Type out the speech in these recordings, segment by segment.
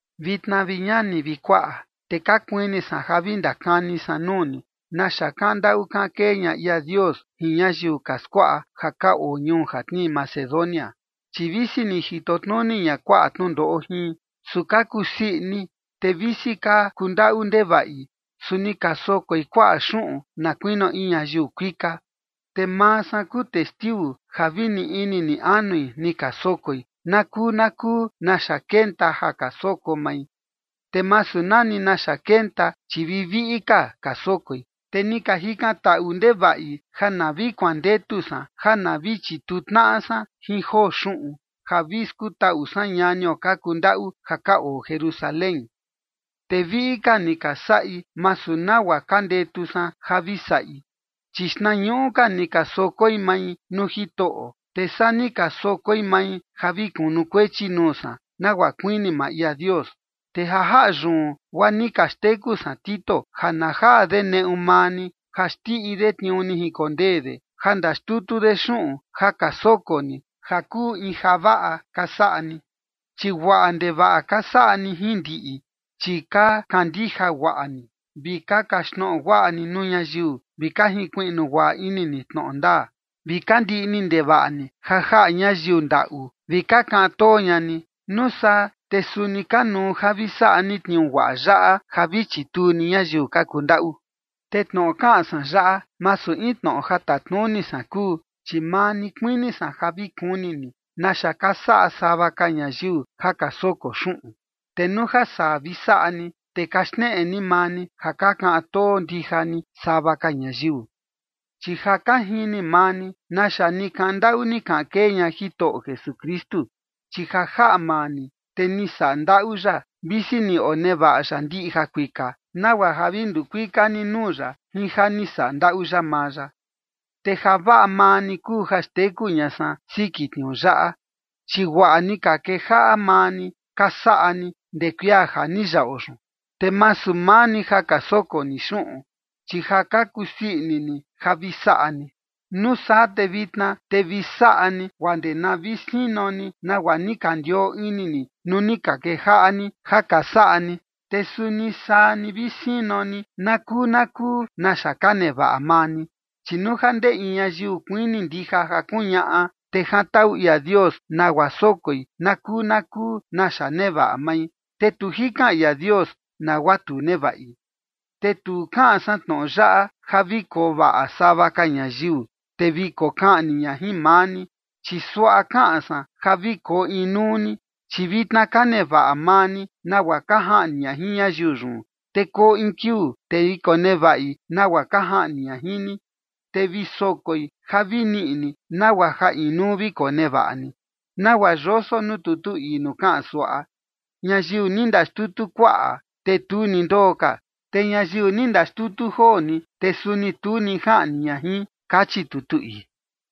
Vitna, vi ñani vi kuaꞌa, te ka kuini san ja vi ndakani san nuu ni naxa kaꞌan ndaꞌu kaꞌan kee ña ia Dios jin ñayiu ka skuaꞌa ja ka oo ñuu ja tnii Macedonia. Chi visi ni jito tnuni ña kuaꞌa tnundoꞌo jin, su ka kusii ini, te visi ka kundaꞌu ndevaꞌi, su ni ka sokoi kuaꞌa xuꞌun na kuinio in ñayiu kuika. Te maa san kuu testiu ja vi ni ini ni anui ni ka sokoi na kuu na kuu naxa kenta ja ka soko mai, te masu nani naxa kenta, chi vi viꞌi ka ka sokoi. Te ni ka jikantaꞌu ndevaꞌi ja na vi kuandetu san ja na vi chituu tnaꞌa san jin joo xuꞌun ja vi skutaꞌu san ñanio ka kundaꞌu ja ka oo Jerusalén. Te viꞌi ka ni ka saꞌi, masu nagua ka ndetu san ja vi saꞌi, chi xtnañuꞌu ka ni ka sokoi mai nuu Jitoꞌo, te saa ni ka sokoi mai ja vi kunukuechi nuu san, nagua kuini maa ia Dios. Te ja jaꞌa yun, guaa ni ka xteku san Tito ja na jaa de neꞌu maa ni ja xndiꞌi de tniuu ni jinkondee de ja ndaxtutu de xuꞌun ja ka soko ni ja kuu in javaꞌa ka saꞌa ni. Chi guaꞌa ndevaꞌa ka saꞌa ni jin ndiꞌi, chi ka kandija guaꞌa ni, vi ka kaxtnoꞌo guaꞌa ni nuu ñayiu, vi ka jinkuiꞌnu guaꞌa ini ni tnoꞌo ndaa, vi ka ndiꞌni ndevaꞌa ni ja jaꞌa ñayiu ndaꞌu vi ka kaꞌan too ña ni. Nuu saa te suni kanuu ja vi saꞌa ni tniuu guaꞌa yaꞌa, ja vi chituu ni ñayiu ka kundaꞌu. Te tnoꞌo kaꞌan san yaꞌa, masu in tnoꞌo ja tatnuni san kuu, chi maa ni kuini san ja vi kuni ni naxa ka saꞌa sava ka ñayiu ja ka soko xuꞌun, te nuu ja saa vi saꞌa ni, te ka xneꞌe ni maa ni ja ka kaꞌan too ndija ni sava ka ñayiu. Chi ja ka jini maa ni naxa ni kaꞌan ndaꞌu ni kaꞌan kee ña Jitoꞌo Jesukristu. Chi ja jaꞌa maa ni, te ni saꞌa ndaꞌu ya, visi ni onevaꞌa ya ndiꞌi jakuika, nagua ja vi nduu kuika ni nuu ya jin ja ni saꞌa ndaꞌu ya maa ya. Te javaꞌa maa ni kuu ja xteku ña san siki tniuu yaꞌa, chi guaꞌa ni ka kejaꞌa maa ni ka saꞌa ni ndee kuia ja ni yaꞌo yun, te masu maa ni ja ka soko ni xuꞌun, chi ja ka kusii ini ni ja vi saꞌa ni. Nuu saa te vitna te vi saꞌa ni guaa ndee na vi sino ni nagua ni ka ndioo ini ni nuu ni ka kejaꞌa ni ja ka saꞌa ni, te suni saa ni vi sino ni na kuu na kuu naxa ka nevaꞌa maa ni. Chi nuu ja ndee in ñayiu kuini ndija ja kuñaꞌa, te jantaꞌu ia Dios nagua sokoi na kuu na kuu naxa nevaꞌa mai, te tu jikan ia Dios nagua tu nevaꞌi. Te tu kaꞌan san tnoꞌo yaꞌa ja vi koo vaꞌa sava ka ñayiu, te vi kokaꞌni ña jin maa ni. Chi suaꞌa kaꞌan san ja vi koo inuu ni, chi vitna ka nevaꞌa maa ni nagua ka jaꞌni ña jin ñayiu yun. Te koo in kiuu, te vi konevaꞌi nagua ka jaꞌni ña jin ni, te vi sokoi ja vi niꞌi ni nagua ja inuu vi konevaꞌa ni. Nagua yoso nuu tutu ii nuu kaꞌan suaꞌa: “Ñayiu ni ndaxtutu kuaꞌa, te tu ni ndoo ka, te ñayiu ni ndaxtutu joo ni, te suni tu ni jaꞌni ña jin” kachi tutu ii.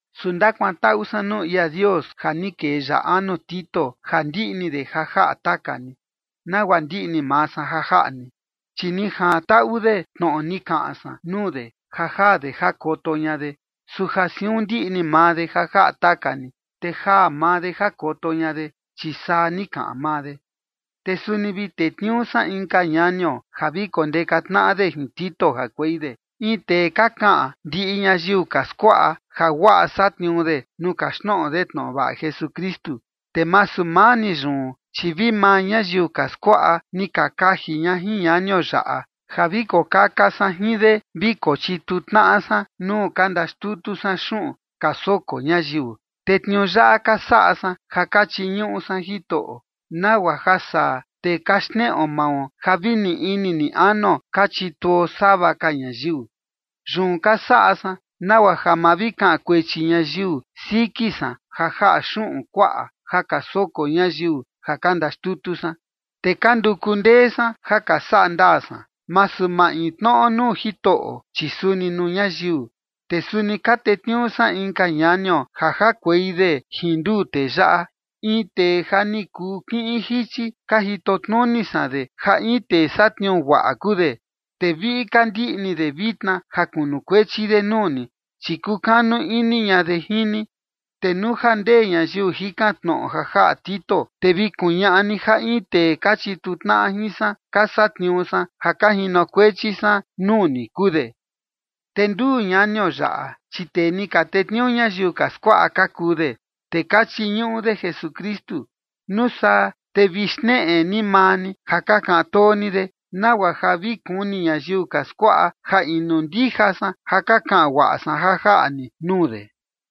Su ndakuantaꞌu san nuu ia Dios ja ni kee ya anu Tito ja ndiꞌni de ja jaꞌa taka ni, nagua ndiꞌni maa san ja jaꞌa ni. Chi ni jantaꞌu de tnoꞌo ni kaꞌan san nuu de ja jaa de jakoto ña de, su ja siun ndiꞌni maa de ja jaꞌa taka ni, te jaa maa de jakoto ña de, chi saa ni kaꞌan maa de. Te suni vi tetniuu san inka ñanio ja vi kondeka tnaꞌa de jin Tito jakuei de, in tee ka kaꞌan ndiꞌi ñayiu ka skuaꞌa, ja guaꞌa satniuu de nuu kaxtnoꞌo de tnoꞌo vaꞌa Jesukristu. Te masu maa ni yun, chi vi maa ñayiu ka skuaꞌa ni ka kaji ña jin ñanio yaꞌa ja vi kokaka san jin de vi kochituu tnaꞌa san nuu ka ndaxtutu san xuꞌun ka soko ñayiu. Te tniuu yaꞌa ka saꞌa san ja ka chiñuꞌu san Jitoꞌo, nagua ja saa, te ka xneꞌo mao ja vi ni ini ni anuo ka chituo sava ka ñayiu. Yun ka saꞌa san nagua ja ma vi kaꞌan kuechi ñayiu siki san ja jaꞌa xuꞌun kuaꞌa ja ka soko ñayiu ja ka ndaxtutu san. Te ka nduku ndee san ja ka saꞌa ndaa san, masu maintnoꞌo nuu Jitoꞌo, chi suni nuu ñayiu. Te suni ka tetniuu san inka ñanio ja jakuei de jin nduu tee yaꞌa, in tee ja ni kuu kiꞌin jichi ka jito tnuni san de ja in tee satniuu guaꞌa kuu de, te viꞌi ka ndiꞌni de vitna ja kunukuechi de nuu ni, chi kukanu ini ña de jin ni. Te nuu ja ndee ñayiu jikan tnoꞌo ja jaꞌa Tito, te vi kuñaꞌa ni ja in tee ka chituu tnaꞌa jin san, ka satniuu san ja ka jinokuechi san nuu ni, kuu de. Te nduu ñanio yaꞌa, chi tee ni ka tetniuu ñayiu ka skuaꞌa ka kuu de, te ka chiñuꞌu de Jesukristu. Nuu saa te vi xneꞌe ni maa ni ja ka kaꞌan too ni de, nagua ja vi kuni ñayiu ka skuaꞌa, ja inu ndija san ja ka kaꞌan guaꞌa san ja jaꞌa ni nuu de.